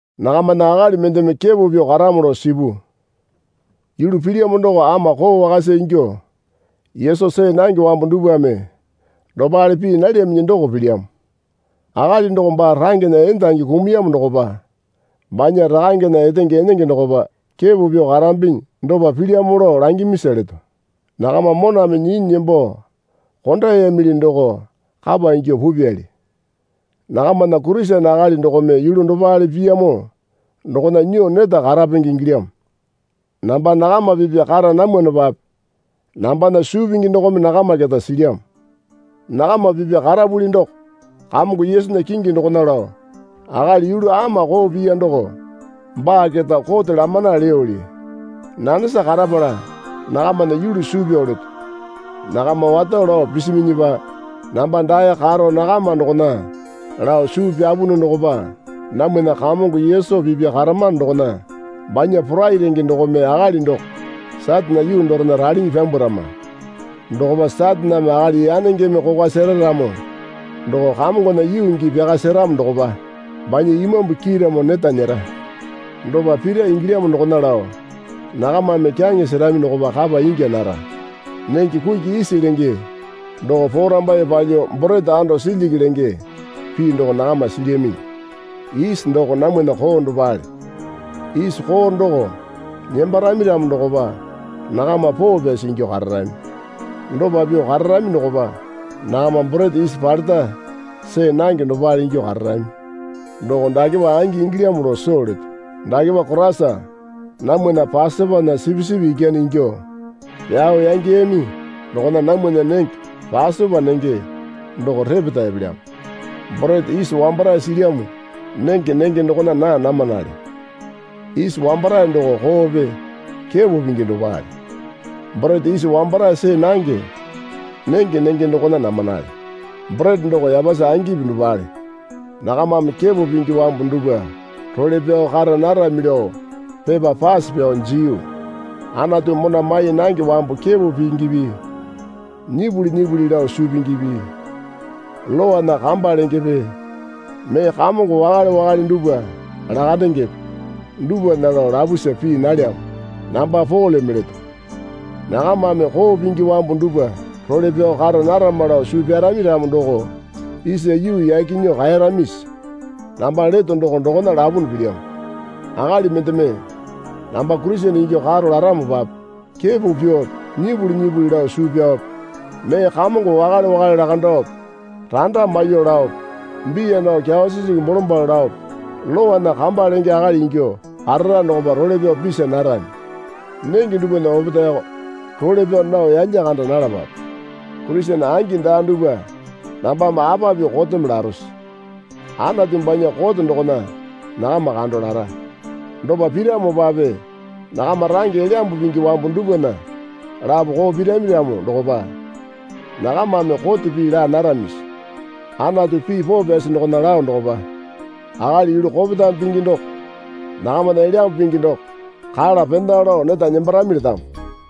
Nakamana akali mendeme kepo pyuo karamo lao sipu. Yulu pilyamo doko ama koo wakasa ingyuo Yesu see nange wambu dupwame dopale pii nalyaminyi doko pilyamo. Akali doko baa rangena endangi kumuyamo dokopa banya rakangena etenge enenge dokopa kepo pyuo karambinyi dopa pilyamo lao langimisa leto. Nakama moname nyinyi nembo kondayamili doko kapa ingyuo pupyali. Nakamana Kurisene akali dokome yulu dopale piyamo dokona nyuo neta karapenge ingilyamo. Namba nakama pipya kara namwanopape nambana suu pingi dokome nakama keta silyamo. Nakama pipya karapuli doko Kamongo Yesunya kingi dokona lao akali yulu ama koo piya doko baa keta kote lamana leyoli. Nanesa karapala nakamana yulu suu pyao leto. Nakama wato lao pisiminyipa namba dae karo nakama dokona lao suu pyapunu dokopa namwana Kamongo Yesu pipya karamano dokona banya porai renge dokome akali doko Satane yuu dorena ralinyi pyambwarama. Dokopa Sataneme akali yanengeme kokwa sera ramo doko Kamongona yuu gii pyaka seramo dokopa banya imambu kiiramo neta nyera. Dopa pira ingilyamo dokona lao nakamame kyaŋe serami dokopa kapa ingya nara. Nenge kuki isi lenge doko porambaiye palyuo borete ando silyiki lenge pii doko nakama silyaminyi. Isi doko namwana koo dopale. Isi koo doko nembarami ramo dokopa nakama poo pyasi ingyuo kararami. Dopa pyuo kararami dokopa nakama borete isi paleta see nange dopale ingyuo kararami. Doko dakepa angi ingilyamo lao soo leto. Dakepa Koraisa namwana Pasopana sipisipi ikyane ingyuo pyao yangeyami dokona namwana nenge Pasopa nenge doko repeta epelyamo. Borete isi wambarae silyamo nenge nenge dokona naa namanale. Isi wambarae doko koope kepo pingi dopale. Borete isi wambarae see nange nenge nenge dokona namanale. Borete doko yapasi angipi dopale. Nakamame kepo pingi wambu dupwa role pyao kara narami lao pepa pase pyao jiyu. Anatu mona mai nange wambu kepo pingipi nyipuli nyipuli lao suu pingipi lowana kamba lengepe mee kamongo wakale wakale dupwa lakandengepe dupwana lao lapusa pii nalyamo namba Poleme leto. Nakamame koo pingi wambu dupwa role pyao kara narama lao suu pyarami ramo doko isa yuu yaki nyuo kaeyaramisi? Namba leto doko dokona lapunu pilyamo. Akali mendeme namba Kurisene ingyuo karo laramopape kepo pyuope nyipuli nyipuli lao suu pyaope mee kamongo wakale wakale lakandaope randa maiyuo laope biya nao kyawa sisingi bolombalo laope lowana kamba lenge akali ingyuo karara dokopa role pyao pisa narami. Nenge dupwana opetaeyoko role pyao nao yalya kanda nalapape. Kurisene angi daa dupwa nambame apa pyuo koteme larose? Anatu banya kote dokona nakama kando lara. Dopa piramopape nakama range Elyambu Pingi wambu dupwana lapo koo pirami ramo dokopa nakamame kote pii laa naramisi? Anatu pii poo pyasi dokona lao dokopa, Akali yulu kopetame pingi doko nakamana Elyambu Pingi doko kala pena lao neta nembarami letamo.